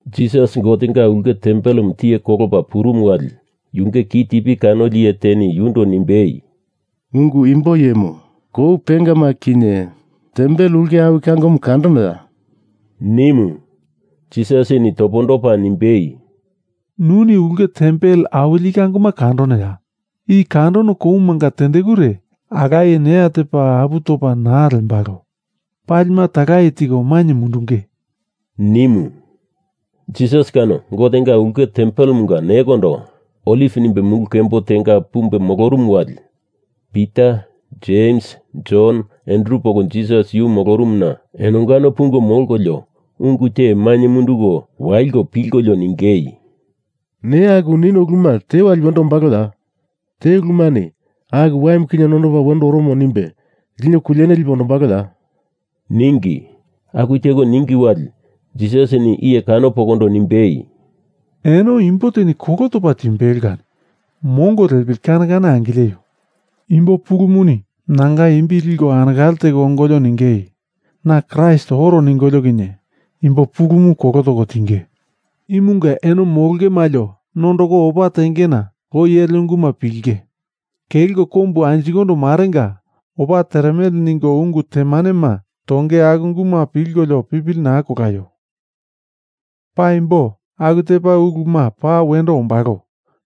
Jisas Gotenga ulke tempelemu tiye kolopa purumu wali yunge kitipi kanoli iye teni yundo nimbei, “Ungu imbo iyemu, kou pengama kinye tempel ulke awi kangomu kandonoya?” nimu. Jisasini topondopa nimbei, “Nuni ulke tempel awili i kangomu kandonoya? I kandono koumanga tendekure alaye neya tepa apu topa naa lembalo. Palima talaye tiko mainye mundunge,” nimu. Jisas kano Gotenga ulke tempelemunga nekondo Oliv nimbe mulu kembo tenga pumbe molorumu wali Pita, Jems, Jon, Andru poko Jisas yu molorumuna enongano pungo molkolio ungu te mainye munduko waliko pilkolio ningei, “Neya aku nino uluma te wali wendo ombaloya? Te ulumani aku waimu kinye nondopa wendo oromo nimbe lino kuliene lipe ondombaloya?” ningi. Aku teko ningi wali, Jisasini iye kano pokondo nimbei, “Eno imbo teni kolo topa timbelo kani mongo lepili wamongo kane kane angileio. Imbo pulumuni nanga imbi liko anekale teko ongolio ningei, ‘na Kraist oro’, ningolio kinye imbo pulumu kolo toko tinge. Imunga eno molonge malio nondoko opa tengena loi ele unguma pilinge. Kelko kombu anjikondo marenga opa teremele ningo ungu temanema tonge aku unguma pilkolio pipili naa kolaio. Paimbo, aku tepa uluma paa wendo ombalo,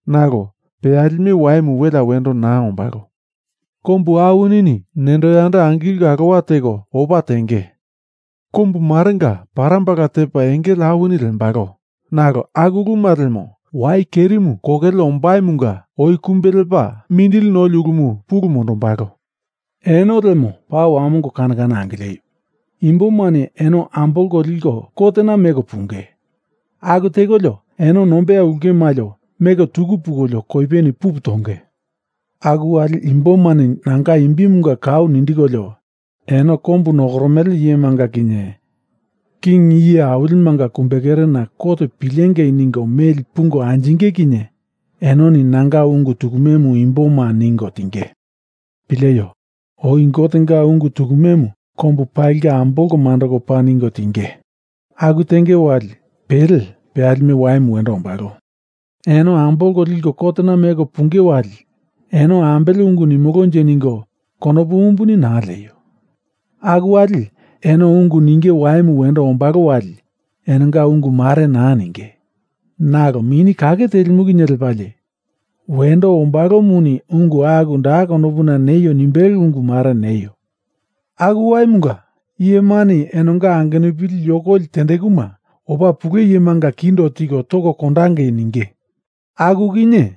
nalo peyalime waimu welea wendo naa ombalo. Kombu awinini nendo yando angilko alowa teko opa tenge. Kombu marenga parambala tepa engele awini lembalo, nalo aku uluma lemo wai kerimu kokele ombaimunga oi kumbe lepa mindili noli ulumu pulu mondombalo. Eno lemo paa wamongo kane kane angileio. Imbomani eno ambolko liko kotena meko punge. Aku tekolio eno nombeya ulke malio meli tuku pungolio koipeni pupu tonge. Aku wali imbomani nanga imbimunga kau nindikolio eno kombu nokoromele iyemanga kinye king iye awilimanga kumbekerena kot pilengei ningo meli pungo anjinge kinye enoni nanga ungu tukumemu imboma ningo tinge. Pileio! Oi Gotenga ungu tukumemu kombu palinga ambolko mandoko paa ningo tiengei. Aku tenge wali, pele peyalime waimu wendo ombalo. Eno ambolko liko kotena meko punge wali, eno ambele ungu nimolonje ningo konopu umbuni naa leaio. Aku wali eno ungu ninge waimu wendo ombalo wali enonga ungu mare naa ninge, nalo Mini Kake Telimu kinye lepalie wendo ombalomuni ungu aku da konopuna neio nimbelo ungu mare neio. Aku waimunga iyemani enonga angenupili yokoli tendekuma opa pule iyemanga kindo tiko toko kondangei ninge. Aku kinye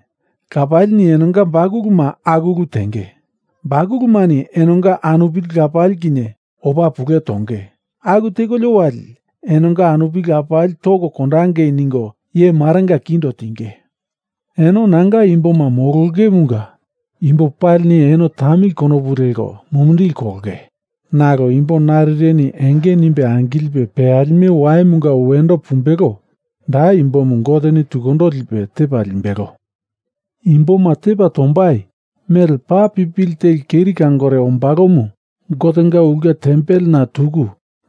lapalini enonga bakuluma aku ulu tenge. Bakulumani enonga anupili lapali kinye opa pule tonge. Aku tekolio wali, enonga anupili lapali toko kondangei ningo iye marenga kindo tinge. Eno nanga imboma molongemunga imbo palini eno tamili konopu leko mumindili kolonge. Nalo imbo narireni enge nimbe angilipe peyalime waimunga wendo pumbelo, da imbomu Goteni tukundo lipe tepa limbelo.” “Imboma tepa tombai mele paa pipili teli keri kangore ombalomu Gotenga ulke tempelena tuku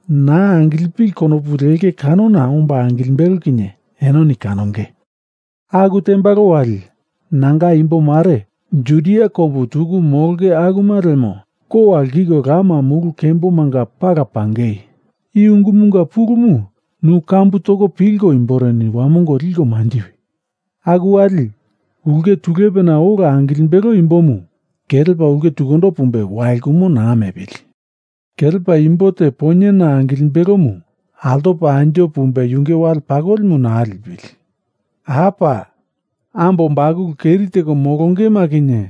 naa angilipili konopu lenge kanona omba angilimbelo kinye enoni kanonge. Aku tembalo wali nanga imbo mare Judia kombu tuku molonge akuma lemo kowa lkiko lama mulu kembomanga pala pangei. (I ungumunga pulumu, nu kambu toko pilko imboreni wamongo liko manjiwi.) Aku wali, ulke tulepena ola angilimbelo imbomu kelepa ulke tukundo pumbe walkumo naa mepili. Kelepa imbo te poinyena angilimbelomu altopa anjo pumbe yunge wale pakolimu naa lipili. Apa! Ambo bakulu keri teko molongema kinye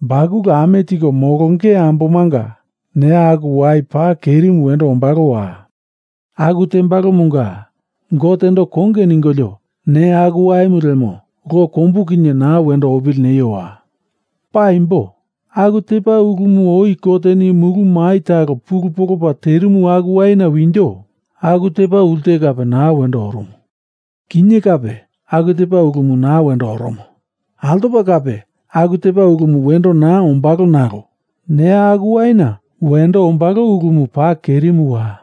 bakulu ame tiko molonge ambomanga neya aku wai paa kerimu wendo ombalowa! Aku tembalomunga Gotendo konge ningolio neya aku waimu lemo lo kombu kinye naa wendo opili neiowa! Paimbo aku tepa ulumu oi Goteni mulu mai talo pulu polopa terimu aku waina winjo aku tepa ulte kape naa wendo orumu. Kinye kape aku tepa ulumu naa wendo oromo. Altopa kape aku tepa ulumu wendo naa ombalo nalo neya aku waina wendo ombalo ulumu paa kerimuwa!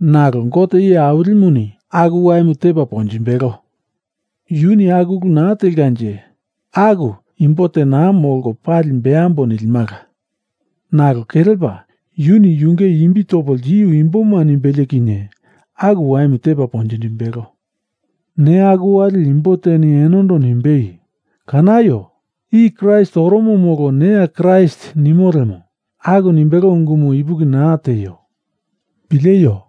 Nalo Gote Iye Awilimuni aku waimu tepa ponjimbelo. Yuni aku ulu naa telkanje, aku imbo te naa molko pali beambo nilimala. Nalo kelepa yuni yunge imbi topo ltiu imboma nimbelie kinye aku waimu tepa ponjindimbelo. Neya aku wali imbo teni enondo nimbei, ‘Kanaio! I Kraist oromo molo neya Kraist,’ nimo lemo, aku nimbelo ungumu ipuki naa tieio. Pileio!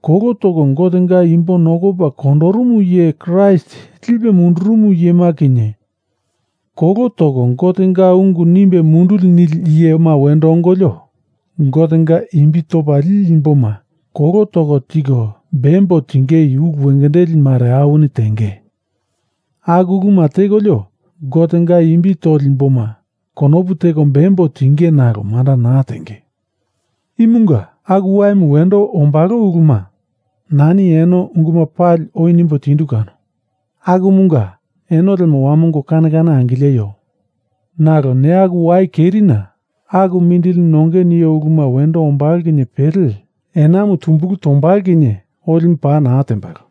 Kolo toko Gotenga imbo nokopa kondorumu iye Kraist lipe mundurumu iyema kinye kolo toko Gotenga ungu nimbe munduli nili iyema wendo ongolio Gotenga imbi topa lili imboma kolo toko tiko bembo tingei ulu wengendeli mare awini tenge. Aku uluma tekolio Gotenga imbi toli imboma konopu teko bembo tingei nalo manda naa tenge. Imunga aku waimu wendo ombalo uluma nani eno unguma pali oi nimbo tindu kano, akumunga eno lemo wamongo kane kane angileio.” “Nalo neya aku wai kerina, aku mindili nonge nio uluma wendo ombalo kinye pele, Enamu tumbulu tombalo kinye olimu pa naa tembalo.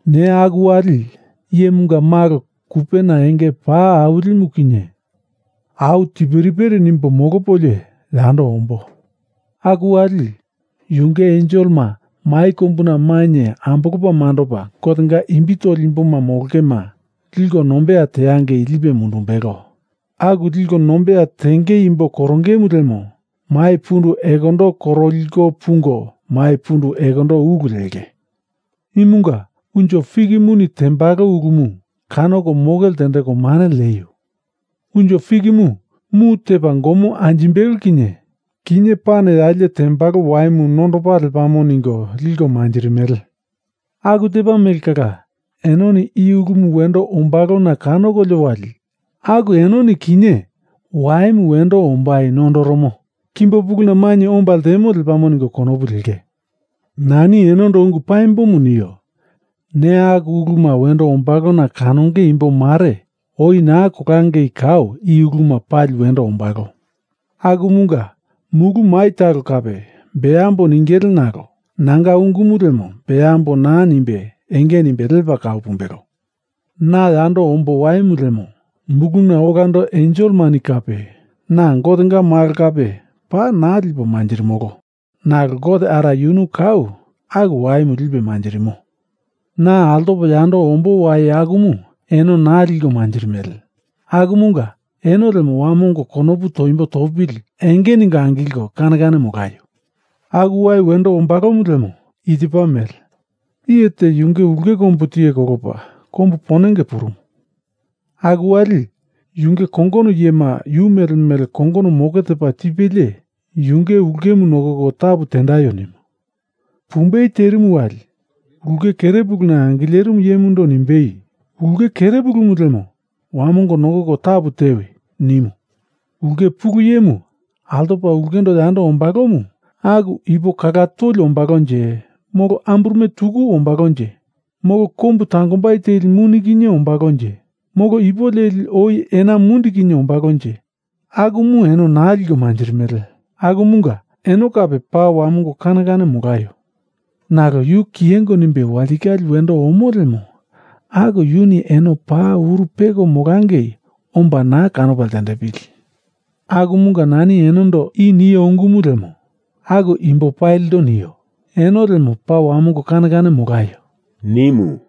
Neya aku wali, Iyemunga Malo kupena enge paa awilimu kinye au tiperipere nimbo molopolie yando ombo. Aku wali, yunge enselema mai kombuna mainye ambolopa mandopa Gotenga imbi toli imbo molongema lipo nombeya teangei lipe mundumbelo. Aku liko nombeya tenge imbo korongeimu lemo mai pundu ekondo koroliko pungo mai pundu ekondo ulu lengei.” “Imunga unjo fikimuni tembalo ulumu kanoko moke ltendeko mane lieio. Unjo fikimu mu tepa gomo anjimbelo kinye, kinye pane yalie tembalo waimu nondopa lepamo ningo liko manjirimele. Aku tepa mele kala, enoni i ulumu wendo ombalona kanokolio wali, aku enoni kinye waimu wendo ombai nondoromo kimbo puluna mainye omba ltemo lepamo ningo konopu lenge. Nani enondo ungu paimbomu nio. Neya aku uluma wendo ombalona kanonge imbo mare oi naa kolangei kau i uluma pali wendo ombalo. Akumunga mulu mai talo kape beambo ningele nalo nanga ungumu lemo beambo naa nimbe enge nimbe lepa kau pumbelo.” “Na yando ombo waimu lemo, muluna olando enselemani kape na Gotenga malo kape paa naa lipo manjirimolo. Nalo Gote Ara yunu kau aku waimu lipe manjirimo. Na altopo yando ombo wai akumu eno naa liko manjirimele. Akumunga eno lemo wamongo konopu toimbo topili enge ningo angilko kane kane molaio. Aku wai wendo ombalomu lemo i tepa mele: iye te yunge ulke kombu tiye kolopa kombu ponenge purumu. Aku wali yunge kongono iyema yu mele mele kongono moke tepa tipelie yunge ulkemu nokoko tapu tendaio nimu. Pumbei terimu wali, ulke kerepuluna angilerimu iyemundo nimbei, ‘Ulke kerepulumu lemo wamongo nokoko tapu tewi,’ nimu. Ulke pulu iyemu altopa ulkendo yando ombalomu aku ipo kala toli ombalonje molo amburume tuku ombalonje, molo kombu tangombai telimuni kinye ombalonje molo ipo leli oi ena mundi kinye ombalonje akumu eno naa liko manjirimele akumunga eno kape paa wamongo kane kane molaio. Nalo yu kiyengo nimbe walitikale wendo omo lemo aku yuni eno paa uru peko molangei omba naa kanopa ltendepili. Akumunga nani enondo i nio ungumu lemo, aku imbo palindo nio. Eno lemo paa wamongo kane kane molaio,” nimu.